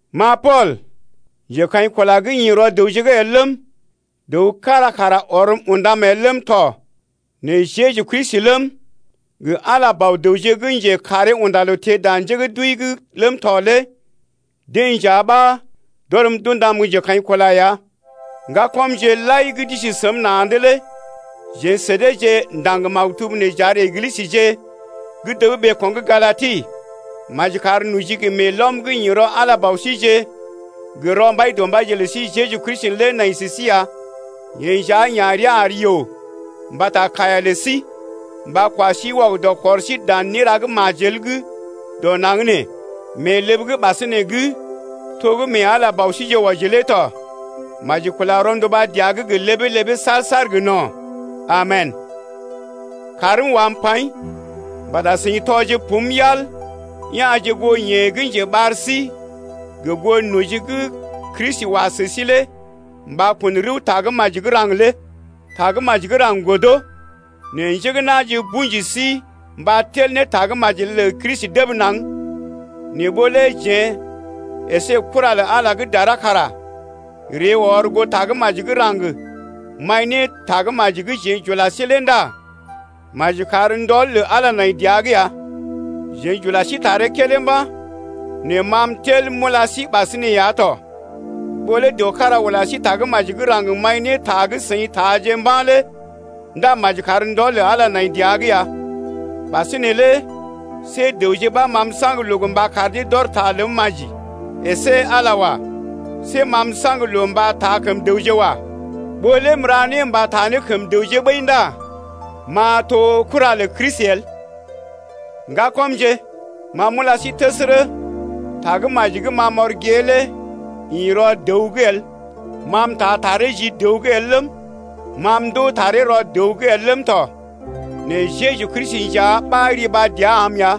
Ma Pool, njekaḭkula gə́ ḭ rɔ dəwje’g el ləm, dəw kára kara ɔrm undam el ləm tɔ nɛ Jeju Kristi ləm, gə Ala, Bɔ-dəwje gə́ njekaree unda loo teḛ dan njé gə́ d’wəi’g ləm tɔ lé deḛ nja ɓa d’ɔrm d’undam gə́ njekaḭkula ya. Ŋgakɔmje lai gə́ d’isi səm na̰’d lé jeḛ sə deeje ndaŋg maktub nee j’ar Eglisəje gə́ dəb ɓeeko̰ gə́ Galati. Maji kar noji gə meelɔm gə́ ḭ rɔ Ala Bɔ síjeḛ gə rɔ Mbaidɔmbaije lə sí Jeju Kristi lé nai sə sí ya. Yeḛ nja ya̰ rəa ar yoo mbata kaiya lə sí, mba kwa sí wɔgədɔ kɔr sí dan néra gə́ majel gə́ dɔ naŋg nee mee ləb gə́ ɓasinè’g to gə́ mee Ala Bɔ síjeḛ wɔji lé tɔ. Maji kula rɔnduba dəa’g gə ləbee-ləbee saar-saar gə no̰. Amen! Kaarm wam paḭ mbata seḭ tɔje pum yal, ya̰je goo yeḛ gə́ njeɓar sí gə goo noji gə́ Kristi wa sə sí lé mba kun rəw Tagə́maji gə́ raŋg lé. Tagə́maji gə́ raŋg godo, nɛ njé gə́ na̰je tuji sí mba tel ne Tagə́maji lə Kristi dəb naŋg. Nɛ ɓó lé jeḛ əsé kura lə Ala gə́ dara kara ree ɔr goo Tagə́maji gə́ raŋg maḭ ne Tagə́maji gə́ jeḛ j’ula sí lé ndá maji kar ndɔl lə Ala nai dəa’g ya. Jeḛ j’ula sí taree kédé mba̰, nɛ ma m’tel m’ula sí ɓasinè ya to: ɓó lé dəw kára ula sí Tagə́maji gə́ raŋg maḭ ne ta gə́ seḭ taaje mba̰ lé ndá maji kar ndɔl lə Ala nai dəa’g ya. Ɓasinè lé see dəwje ɓa ma m’saŋg loo mba kar dee d’ɔr ta ləm maji əsé Ala wa. See ma m’saŋg loo mba taa kəm dəwje wa. Ɓó lé m’ra né mba taa ne kəm dəwje ɓəi ndá m’a to kura lə Kristi el. Ŋgakɔmje, ma m’ula sí təsərə, tagə́maji gə́ ma m’ɔr gée lé ḭ rɔ dəw’g el. Ma m’taa taree ji dəw’g el ləm, ma m’ndoo taree rɔ dəw’g el ləm tɔ, nɛ Jeju Kristi nja ɓa riba dəa am ya.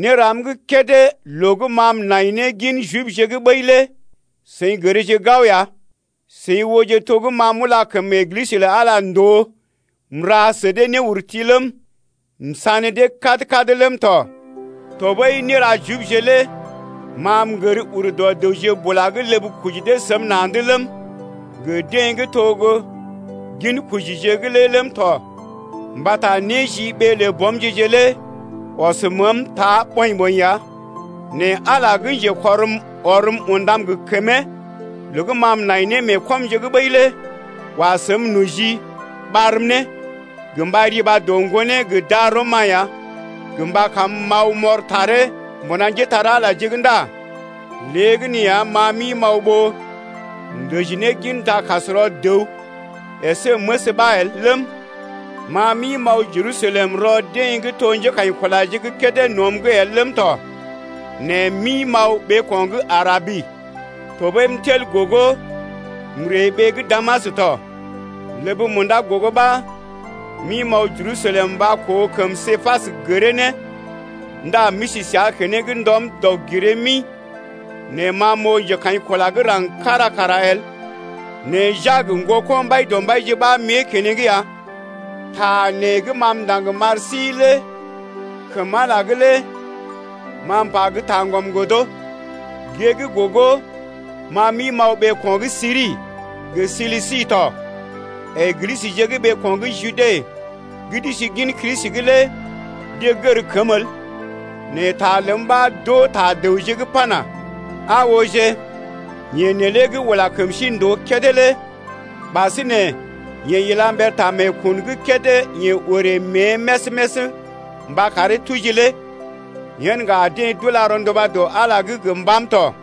Néram gə́ kédé loo gə́ ma m’nai ne gin Jibje’g ɓəi lé seḭ gərje gao ya, seḭ ooje to gə́ ma m’ula kəm Eglisə lə Ala ndòo m’ra sə dee néurti ləm, m’sané dee kad-kad ləm tɔ. Tɔɓəi néra Jibje lé ma m’gər ur dɔ dəwje bula gə́ ləb koji dee səm na̰’d ləm, gə deḛ gə́ to gə́ ginkojije lé ləm tɔ mbata néjiɓee lə bɔmje-je lé ɔs məəm ta ɓɔḭ-ɓɔḭ ya. Nɛ Ala gə́ njekɔrm ɔrm undam gə kəmee loo gə́ ma m’nai ne mee kɔmje’g ɓəi lé wa səm noji ɓarm ne gə mba riba ne dɔ Ŋgonee gə darɔm-ma ya gə mba kam m’aw m’ɔr taree mbuna njépole-magəje’g ndá léegəneeya, ma m’ḭ m’aw ɓó m’dəji ne gin dakasrɔ dəw əsé məs ɓa el ləm, ma m’ḭ m’aw Jerusalem rɔ deḛ gə́ to njékaḭkulaje gə́ kédé nɔm’g el ləm tɔ nɛ m’ḭ m’aw ɓeeko̰ gə́ Arabi. Tɔɓəi m’tel gogo m’ree ɓee gə́ Damas tɔ. Ləb munda gogo ɓa m’ḭ m’aw Jerusalem mba koo kəm Képas gəree ne ndá m’isi səa keneŋ ndɔm dɔg-giree-mi. Nɛ ma m’oo njekaḭkula gə́ raŋg kára kara el, nɛ Jak ŋgoko̰ Mbaidɔmbaije ɓa m’ée keneŋ ya. Ta nee gə́ ma m’ndaŋg m’ar sí lé kəm Ala’g lé ma m’pa gə́ taŋgɔm el. Gée gə́ gogo ma m’ḭ m’aw ɓeeko̰ gə́ Siri gə Silisi tɔ. Eglisəje gə́ ɓeeko̰ gə́ Jude gə́ d’isi gin Kristi’g lé deḛ gər kəm el. Nɛ ta ləm ɓa d’oo ta dəwje’g pana: Aa ooje, yeḛ neelé gə́ ula kəm sí ndòo kédé lé ɓasinè yeḛ ila mber ta meekun gə́ kédé yeḛ orè mée més-més mba karee tuji lé. Yen ŋga deḛ d’ula rɔnduba dɔ Ala’g gə mbàm tɔ.